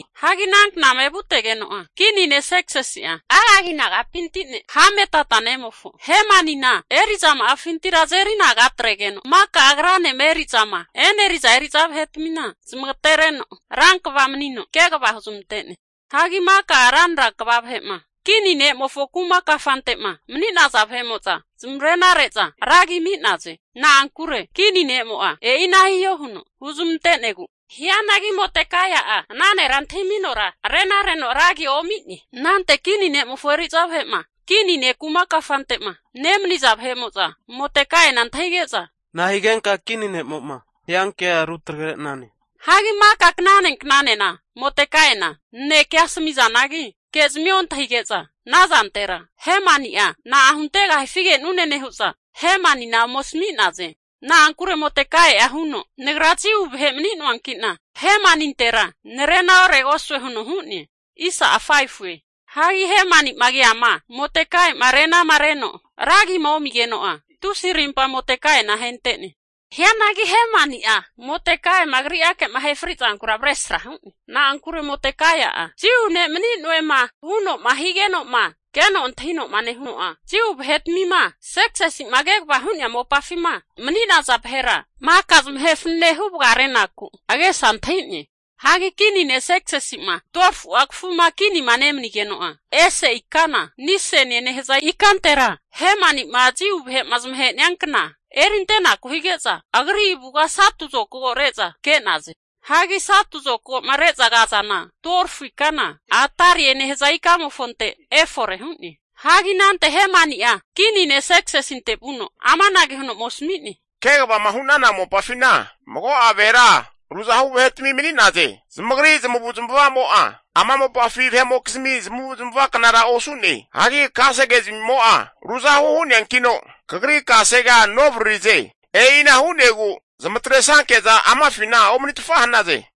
Hagi ana knama evutegeno'a, kini ne' Serksisi'a Agagi nagapinti ne' Hamedata nemofo Hemanina eri'zama'afintira azeri anaga atregeno maka agranema eri'zama e'neriza eri'za vahetmina zmagatereno rankva manino kegava huzmantene. Hagi maka ranra kva vahe'ma kini ne'mofo kuma kafante'ma mani'naza vahe'mo'za zamare'na re'za ra agia Hemanina ami'naze. Na'ankure kini ne'mo'a, e'ina hiho huno huzmante'negu anara hu'naze. Hianagi Modekai'a ana nera antahiminora arena reno ra agia omi'ne. Anante kini ne'mofo eri'za vahe'ma kini ne' kuma kafante'ma nemani'za vahe'mo'za Modekaina antahige'za, nahigenka kini ne'mo'ma hiankea rutagre'nane? Hagi maka knane knanena Modekaina nanekea asami'nazanagi, kezmia ontahige'za ana zantera Hemani'a na'a huntegahifi ke'nune nehu'za Hemanina ome asmi'naze. Na'ankure Modekaia'a huno nagra Jiu vahe mani'noanki'na Hemanintera narena oregosue huno hu'ne. Hagi Hemani'ma keama Modekaia'ma arenama reno ragima omigeno'a, tusi arimpa Modekaina ahente'ne. Hianagi Modekai'ma agriake'ma ahe frizankura avresra Hemani'a hu'ne. Na'ankure Modekai'a Jiu ne' mani'noema huno'ma higenoma keno antahinoma nehuno'a, Jiu vahetmima Serksisima kegavama hu'nea maka mopafima mani'naza vahera maka zamahe fanene hu vagarenaku agesa antahi'ne. Hagi kini ne' Serksisi'ma 12fu'a kafuma kinima nemanigeno'a, ese ikana Nisanie nehaza ikantera Hemanima Jiu vahe'ma zamahenia kna erintenaku hige'za agri avuga satu zokago re'za ke'naze. Hagi satu zokagoma re'za kazana 12fu ikana Adarie nehaza ikamofonte efore hu'ne. Hagi anante Hemani'a kini ne' Serksisinte vuno amanage huno ome asmi'ne, Kegavama hu'nana mopafina mago'a vahera ruzahu vahetami mani'naze. Zamagri zamavu'zmavamo'a ama mopafi vahe'mokizmi zamavuzmava knara osu'ne. Hagi kasegezmimo'a ruzahu hu'neankino, kagri kasegea novaririze. E'ina hu'negu zamatresanke'za amafina omanitfa hanaze.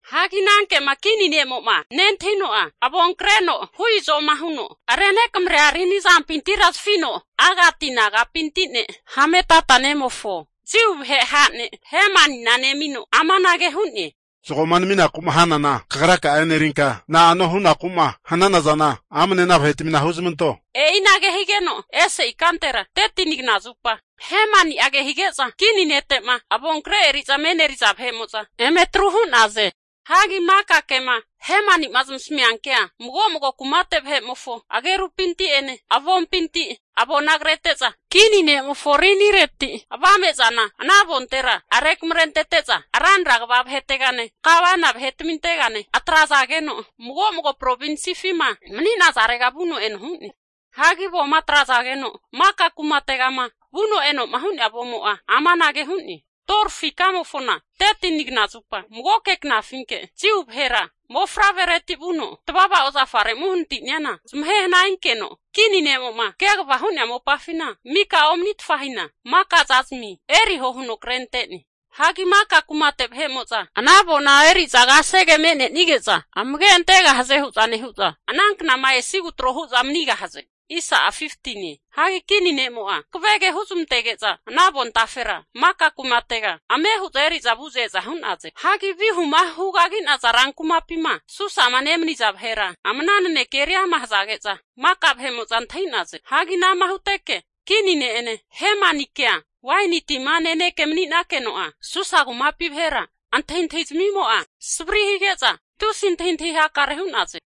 Hagi ana kema kini ne'mo'ma nentahino'a, avonkreno hu izoma huno renekamrea rini azampinti zafino Agati nagapinte ne' Hamedata nemofo Jiu vahe ha' ne' Hemanina nemino, amanage hu'ne, Zagoma naminaku'ma hanana kagraka'a enerinka, na'anoma hunaku'ma hanana zana amne ana vahetmina huzmanto. E'inage higeno ese ikantera 13ni kna zupa Hemani'a kehige'za kini nete'ma avonkre eri'zama e'neri'za vahe'mo'za eme atru hu'naze. Hagi maka kema zamasamia kea mago mago kumate vahe'mofo agerupinti'ene avompinti avona krete'za kini nemofo rinireti avame'za ana avontera rekamrentete'za ranra kva vahetegane (Satraps), gavana vahetamintegane atrazageno mago mago provinsifima mani'nazarega vuno eno hu'ne. Hagi avoma atrazageno maka kumategama vuno eno'ma hu'nea avomo'a anage hu'ne, 12fu ikamofona 13ni knazupa magoke knafinke Jiu vahera mofavrereti vuno tavava ozafare'ma uhanati'neana zamahe hana hinkeno, kini ne'mo'ma kegavama hu'nea mopafina miko omanitfa hina, maka zazmi eriho huno kretre'ne. Hagi maka kumate vahe'mo'za ana avona eri'za kasege me'nenige'za amage antegahaze hu'za nehu'za, ana knama esigu tro hu'za manigahaze. Hagi kini ne'mo'a hankave ke huzmantege'za ana avontafera maka kumatega ame hu'za eri'za vu'za eza hu'naze. Hagi vihuma hugagi'naza rankumapima Susama nemani'naza vahera ama ana nanekea eriama hazage'za maka vahe'mo'za antahi'naze. Hagi anama huteke kini ne'ene kea waini tina nenekema mani'nakeno'a Susa kumapi vahera antahintahi zamimo'a savri hige'za tusi koro nehu'za antahitahi hakare hu'naze.